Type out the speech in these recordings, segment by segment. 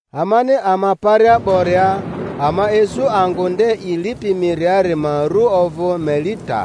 Amani ama paria 'boria, ama isu angᴜ nde i lipi miriari ma ru ovᴜ Melita.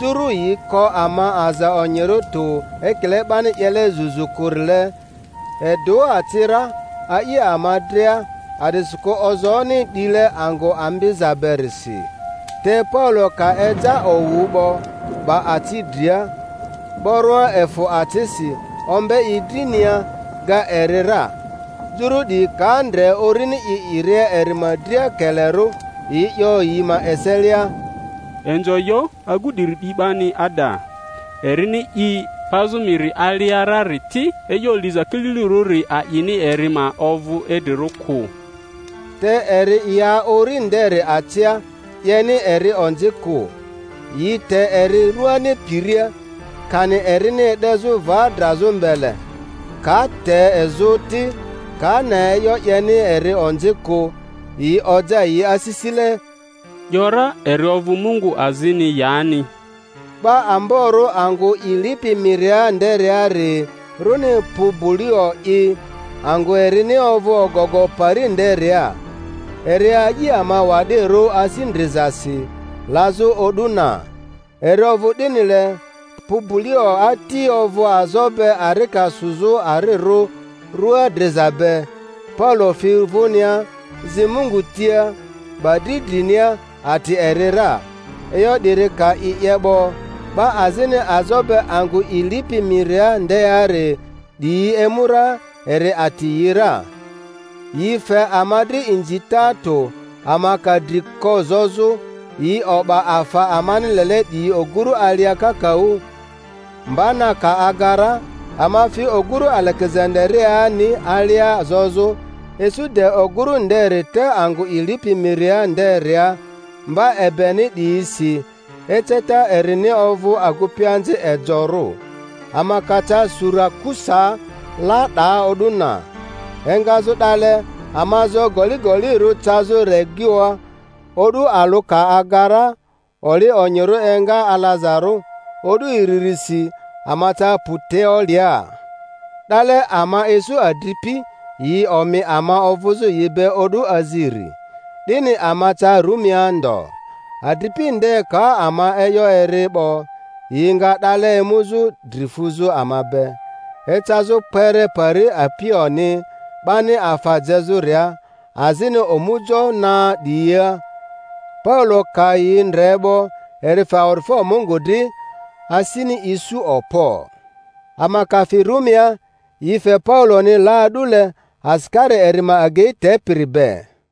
Juru yi ko ama aza onyirᴜ tᴜ ekile 'bani 'yele zuzu kᴜrile, edᴜ aci ra, a'i ama dria, a'disikᴜ ozooni 'dile angᴜ ambiza berisi. Te Paulo ka eja owu 'bo, 'ba aci dria, 'boroa efᴜ acisi, ombe i drinia, ga eri ra. Juru 'diyi ka ndre urini i 'iria eri ma dria kelerᴜ, yi 'yo yi ma eselia, Inzo yo agu 'diri 'di 'bani ada. Erini i pazᴜ miri alia rari ti, e'yo liza kililirᴜri a'ini eri ma ovᴜ idrirᴜ kᴜ. Te eri ya uri nderi acia, 'yeni eri onzi kᴜ. Yi te eri rᴜani piria, kani erini e'dezᴜ va drazᴜ mbele; ka te izᴜ ti, ka ne e'yo 'yeni eri onzi kᴜ, yi oja yi asisile, 'yo ra eri ovᴜ mungu azini yani. 'Ba amborᴜ angᴜ i lipi miria nderiari, runi Pubulio'i, angᴜ erini ovᴜ ogogo pari nderia. Eri a'i ama wa'dirᴜ asi ndrizasi, lazᴜ o'du na. Eri ovᴜ 'dinile, Pubulio ati ovᴜ azo be arika sᴜzᴜ arirᴜ rua driza be; Paulo fi vᴜnia, zi Mungu tia, 'ba dri drinia, ati eri ra. E'yo 'diri ka i 'ye 'bo, 'ba azini azo be angᴜ i lipi miria ndeari 'diyi emu ra, eri ati yi ra. Yi fe ama dri inzita tᴜ; ama ka dri ko zozᴜ, yi o'ba afa amani lele 'diyi ogᴜrᴜ alia kakaᴜ. Mba na ka aga ra, ama fi oguru Alegezandariani alia zozᴜ; isu de ogurᴜ nderi te angᴜ i lipi miria nderia mba egbeni 'diyisi; eceta erini ovᴜ Agupianzi Ejorᴜ. Ama ca Surakusaa, la 'daa o'du na. Engazᴜ 'dale ama zo goligolirᴜ cazᴜ Regioa; o'du alᴜ ka aga ra, oli onyirᴜ enga alazarᴜ, o'du iririsi ama ca Puteolia. 'Dale ama isu adripi, yi omi ama ovᴜzᴜ yi be o'du aziri. 'Dini ama ca Rumia ndo. Adripi nde ka ama e'yo eri 'bo, yi nga 'dale emuzᴜ dri fuzᴜ ama be, ecazᴜ kpere pari Apioni 'bani afa jezᴜria, azini Omujo Na 'Diyia. Paulo ka yi ndre 'bo, eri fe awa'difo Mungu dri, asini isu okpo. Ama ka fi Rumia, yi fe Pauloni la a'dule, asikari eri ma agei tepiri be.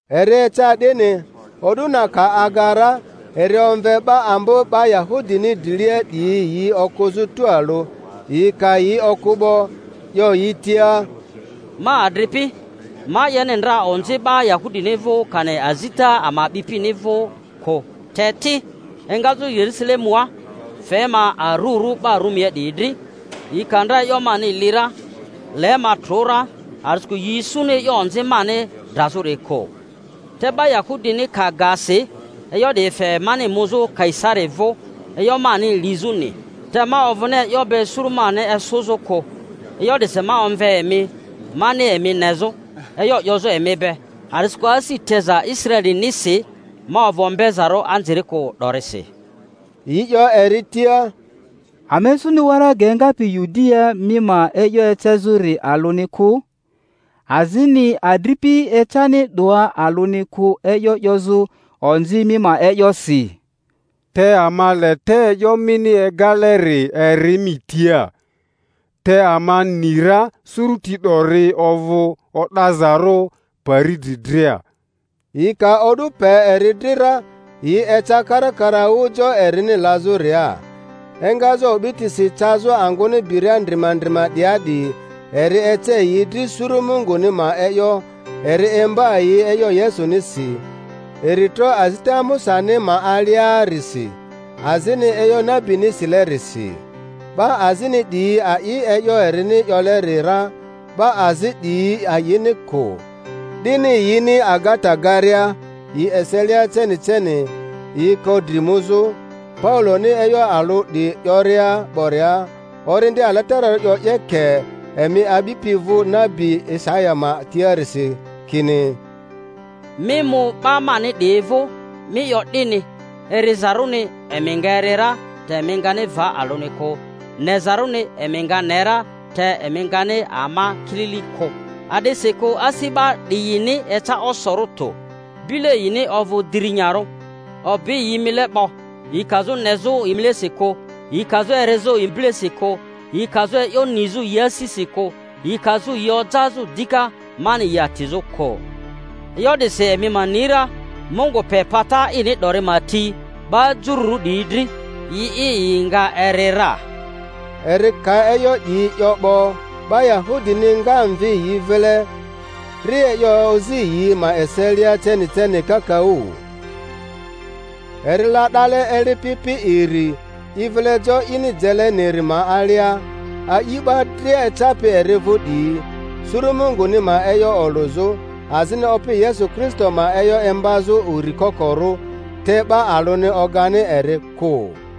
Eri eca 'dini, o'du na ka aga ra, eri omve 'ba ambo 'ba Yahudini drilia 'diyi yi okᴜzᴜ tualᴜ; yi ka yi okᴜ 'bo, 'yo yi tia, Ma adripi, ma 'yeni ndra onzi 'ba Yahudini vᴜ kani azita ama a'bipini vᴜ kᴜ, te ti, engazᴜ Yerusalemua fe ma arurᴜ 'ba Rumia 'diyi dri. Yi ka ndra e'yo mani li ra, le ma trᴜ ra, a'disikᴜ yi isuni e'yo onzi mani drazᴜri kᴜ. Te 'ba Yahudini ka ga si, e'yo 'di fe mani muzᴜ Kaisari vᴜ e'yo mani lizᴜni—te ma ovᴜni e'yo be suru mani esᴜzᴜ kᴜ. E'yo 'disi ma omve emi mani emi nezᴜ, e'yo 'yozᴜ emi be, a'disikᴜ asi teza Israelinisi ma ovᴜ ombezarᴜ anzirikᴜ 'dorisi. Yi 'yo eri tia, Ama isuni waraga engapi Yudiaa mi ma e'yo ecezᴜri alᴜni kᴜ, azini adripi ecani 'doa alᴜni kᴜ e'yo 'yozᴜ onzi mi ma e'yosi. Te ama le te e'yo mini egaleri eri mi tia; te ama ni ra suruti 'dori ovᴜ o'dazarᴜ pari dri dria. Yi ka o'du pe eri dri ra, yi eca karakaraᴜ jo erini lazᴜria. Engazᴜ o'bitisi cazᴜ angᴜni biria ndrima ndrima 'dia 'di, eri ece yi dri suru Munguni ma e'yo, eri imba yi e'yo Yesunisi, iri tro azita Musani ma aliarisi. azini e'yo nabini silerisi. 'Ba azini 'diyi a'i e'yo erini 'yoleri ra, 'ba azi 'diyi a'ini kᴜ. 'Dini yini agata garia yi eselia ceni ceni, yi ko dri muzᴜ, Pauloni e'yo alᴜ 'di 'yoria 'boria: Orindi Alatararᴜ 'yo 'yeke emi a'bipi vᴜ nabi Isaya ma tiarisi, kini: Mi mu 'ba mani 'diyi vᴜ, mi 'yo 'dini, Erizarᴜni emi nga eri ra, te emi ngani va alᴜni kᴜ, nezarᴜni emi nga ne ra, te emi ngani ama kilili kᴜ. A'disikᴜ asi 'ba 'diyini eca osorᴜ tᴜ, bile yini ovᴜ dirinyarᴜ, obi yi mile 'bo; yi kazᴜ nezᴜ yi milesi kᴜ, yi kazᴜ erizᴜ yi bilesi kᴜ, yi kazᴜ e'yo nizᴜ yi asisi kᴜ, yi kazᴜ yi ojazᴜ dika mani yi atizᴜ kᴜ. E'yo 'disi emi ma ni ra, Mungu pe pata ini 'dori ma ti 'ba Jururᴜ 'diyi dri; yi'i yi nga eri ra. Eri ka e'yo 'diyi 'yo 'bo, 'ba Yahudini nga mvi yi vile, ri e'yo ozi yi ma eselia ceni ceni kakaᴜ. Eri la 'dale eli pi pi iri, i vile jo ini jeleniri ma alia, a'i 'ba dria ecapi eri vᴜ 'diyi, suru Munguni ma e'yo olᴜzᴜ, azini Opi Yesu Kristo ma e'yo imbazᴜ uri kokoru, te 'ba alᴜni ogani eri kᴜ.